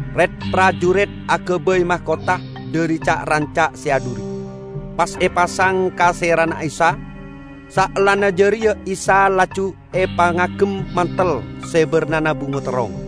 Rit-parjurit agabay makotha dhari ca'-ranca' se adhuri, pas epasang ka serana Isa. Saellana jareya Isa laju epangagem mantel se barnana bungo terrong,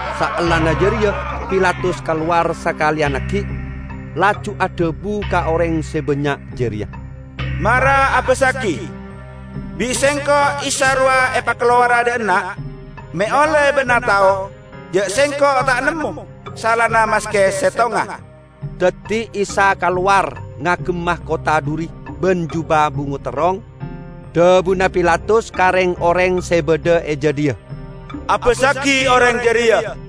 Saellana jareya Pilatus kalowar sakaleyan aggi', laju adhabu ka oreng se bannya' jareya, "Mara abassagi! Bi' sengko' Isa rowa epakalowara dha'enna' me' olle' ba'na tao ja' sengko' ta' nemmo salana maske settonga." Daddi Isa kalowar ngagem makotha dhuri ban juba bungo terrong. Dhabuna Pilatus ka reng-oreng se badha e jadhiya, "Abassagi oreng jareya!"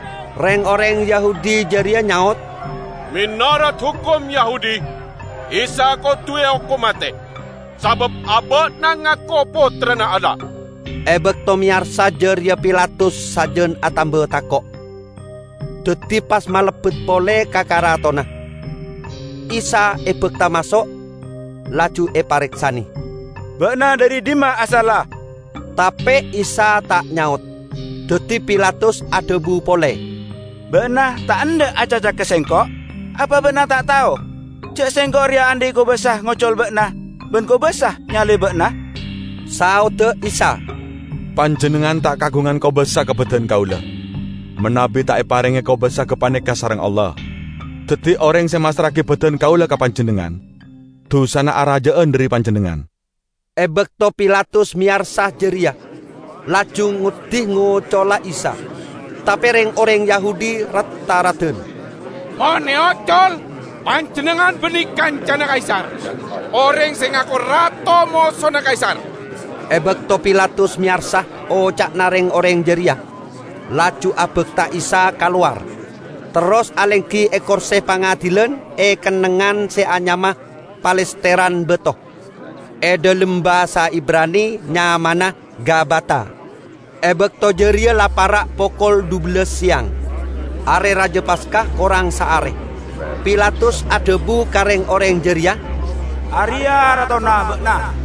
Reng-oreng Yahudi jareya nyaot, "Menorot hokom Yahudi Isa kodu eokom mate sabab aba'na ngako Pottrana Allah." E bakto meyarsa jareya Pilatus sajan atamba tako'. Daddi pas malebbet pole ka karatonna. Isa ebakta maso', laju epareksane, "Ba'na dhari dhimma asalla?" Tape Isa ta' nyaot. Daddi Pilatus adhabu pole, "Ba'na ta' endha' acaca ka sengko'? Apa Ba'na ta' tao ja' sengko' reya andhi' kobasa ngocol Ba'na, ban kobasa nyalib Ba'na?" Saodda Isa, "Panjennengngan ta' kaagungan kobasa ka badan Kaula manabi ta' eparenge kobasa gapaneka sareng Allah. Daddi oreng se massra'agi badan Kaula ka panjennengngan, dusana araja'an dhari panjennengngan." E bakto Pilatus meyarsa jareya, laju ngoddi ngocola Isa, tape reng-oreng Yahudi rat-tharadan, "Mon eocol, panjennengngan banne kancana Kaisar! Oreng se ngako rato, mosona Kaisar!" E bakto Pilatus meyarsa oca'na reng-oreng jareya, laju abakta Isa kalowar, terros alenggi e korse pangadilan e kennengngan se anyama Palesteran Bato. (E dhalem basa Ibrani nyamana Gabata.) E bakto jareya la para' pokol dhubellas seyang. Are Raja Paska korang saare. Pilatus adhabu ka reng-oreng jareya, "Areya' ratona ba'na!"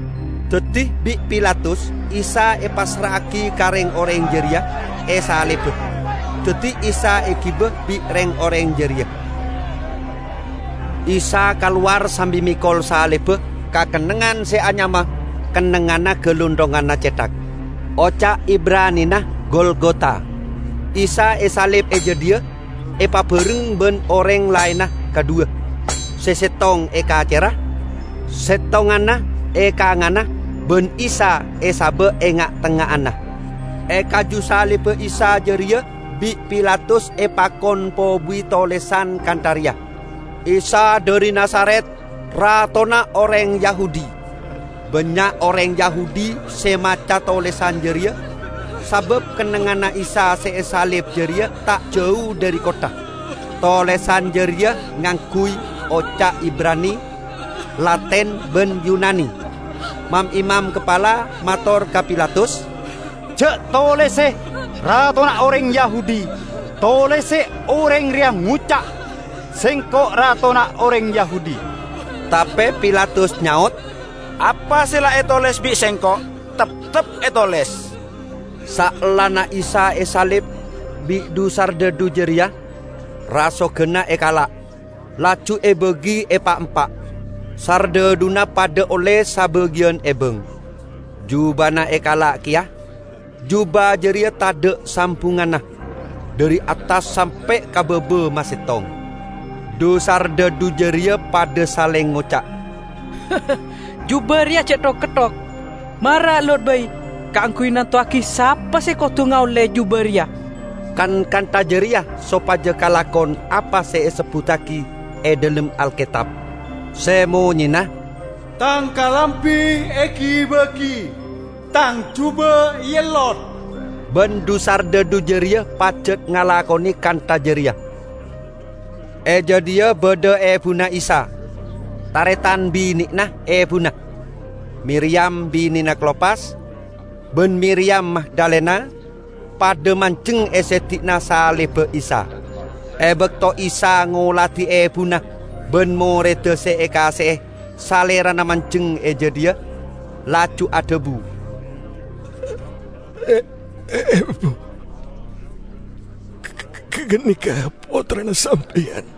Daddi bi' Pilatus Isa epassra'agi ka reng-oreng jareya, esaliba. Daddi Isa egiba bi' reng-oreng jareya. Isa kalowar sambi mekol salibba ka kennengngan se anyama "Kennengnganna Galunthonganna Cethak". (Oca' Ibranina Golgota.) Isa esalib e jadhiya, epabareng ban oreng laenna kadhuwa; se settong e kacerra, settonganna e kanganna ban Isa esaba' e nga'-tengnga'anna. E kaju salibba Isa jareya bi' Pilatus epakon pobuwi tolesan kantha reya: "Isa dhari Nazaret, Ratona Oreng Yahudi." Bannya' oreng Yahudi se maca tolesan jareya sabab kennengnganna Isa se esalib jareya ta' jau dhari kottha. Tolesan jareya ngangguy oca' Ibrani, Latin ban Yunani. Mam-imam kapala mator ka Pilatus, "Ja' tolese 'Ratona Oreng Yahudi', tolese 'Oreng Reya ngoca', Sengko' Ratona Oreng Yahudi.' " Tape Pilatus nyaot, "Apa se la etoles bi' sengko' teptep etoles." Saellana Isa esalib bi' dhu-sardhadhu jareya, rasoganna ekala', laju ebagi epaempa, sardhadhuna padha olle sabagiyan ebang. Jubana ekala' keya. Juba jareya tadha' sambungnganna, dhari attas sampe' ka baba masettong. Dhu-sardhadhu jareya padha saleng ngoca', "Juba reya ja' thok-ketthok. Mara ellot bai kaangguy nantowagi sapa se kodu ngaolle juba reya." Kan kantha jareya sopaja kalakon apa se esebbuttagi e dhalem Alketab, se monyena: "Tang kalambi egi-bagi, Tang juba eellot." Ban dhu-sardhadhu jareya pajat ngalakone kantha jareya. E jadhiya badha ebuna Isa, taretan bine'na ebuna, Miriyam binena Klopas, ban Miriyam Magdalena, padha manjeng e seddi'anna salibba Isa. E bakto Isa ngoladi ebuna ban moredda se ekaase'e Salerana manjeng e jadhiya, laju adhabu, "Ebu, ganeka pottrana sampeyan."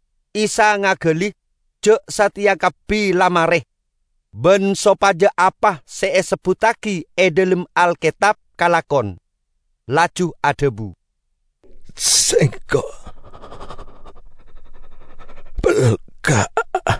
Isa ngagali ja' sateya kabbi la mare, ban sopaja apa se esebbuttagi e dhalem Alketab kalakon, laju adhabu, "Sengko' pelka'."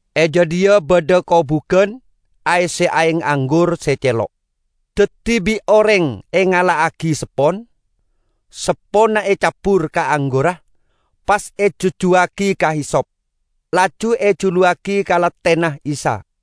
E jadhiya badha kobugan aesse aeng anggur se celo'. Daddi bi' oreng engala'agi seppon, sepponna ecabbur ka anggurra, pas e jujjuwagi ka hisop, laju ejuluwagi ka lathena Isa.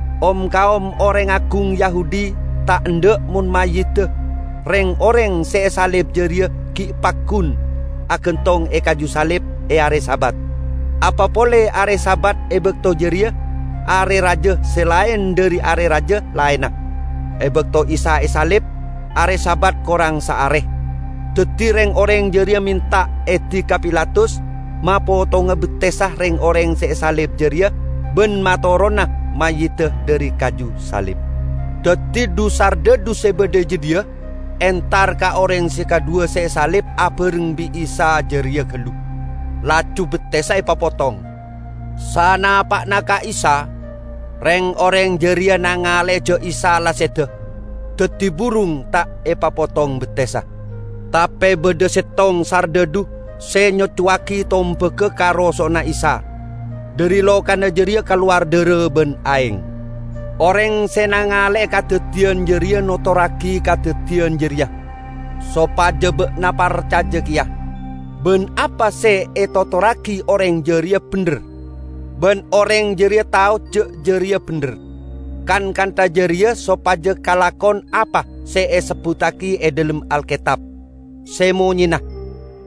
Om-kaom oreng agung Yahudi ta' endha' mon mayyidda reng-oreng se esalib jareya gi' paggun agantong e kaju salib e are Sabat, apa pole are Sabat e bakto jareya Are Raja se laen dhari are raja laenna. E bakto Isa esalib are Sabat korang saare, daddi reng-oreng jareya menta edi ka Pilatus mapotonga bettessa reng-oreng se esalib jareya ban matorona mayyidda dhari kaju salib. Daddi dhu-sardhadhu se badha e jadhiya entar ka oreng se kadhuwa se esalib abareng bi' Isa jareya gallu, laju bettessa epapotong. Sanapa'na ka Isa, reng-oreng jareya nangale ja' Isa la seda, daddi burung ta' epapotong bettessa. Tape badha settong sardhadhu se nyocowagi tombagga ka roso'na Isa; dhari lokana jareya kalowar dhara ban aeng. Oreng se nangale'e kadaddiyan jareya notorragi kadaddiyan jareya, sopaja ba'na parcaja keya. Ban apa se etotorragi oreng jareya bendher, ban oreng jareya tao ja' jareya bendher. Kan kantha jareya sopaja kalakon apa se esebbuttagi e dhalem Alketab, se monyena,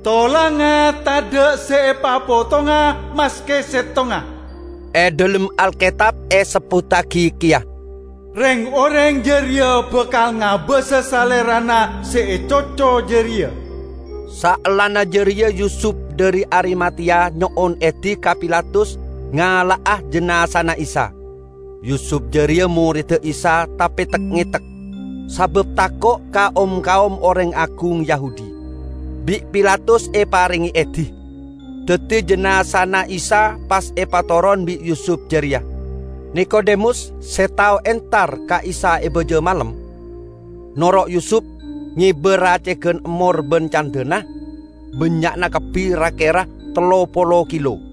"Tolangnga tadha' se epapotonga maske settonga". E dhalem Alketab esebbuttagi keya, "Reng-oreng jareya bakal ngabasa Salerana se ecoco jareya." Saellana jareya Yusup dhari Arimateya nyo'on edi ka Pilatus ngala'a jinazana Isa. (Yusup jareya moredda Isa tape tek-ngetek, sabab tako' ka om-kaom oreng agung Yahudi.) Bi' Pilatus eparenge edi, daddi jinazana Isa pas epatoron bi' Yusup jareya. Nikodemus se tao entar ka Isa e baja malem, noro' Yusup, ngeba racegan emmor ban candhana, bannya'na kabbi ra-kera tello polo kilo.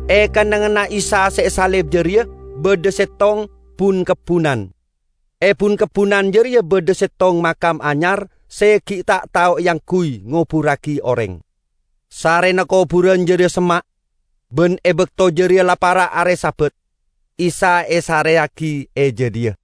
E kennengnganna Isa se esalib jareya badha settong bun-kebbunan. E bun-kebbunan jareya badha settong makam anyar se gi' ta' tao eangguy ngoburragi oreng. Sarrena koburan jareya semma', ban e bakto jareya la para' are Sabat, Isa esareyagi e jadhiya.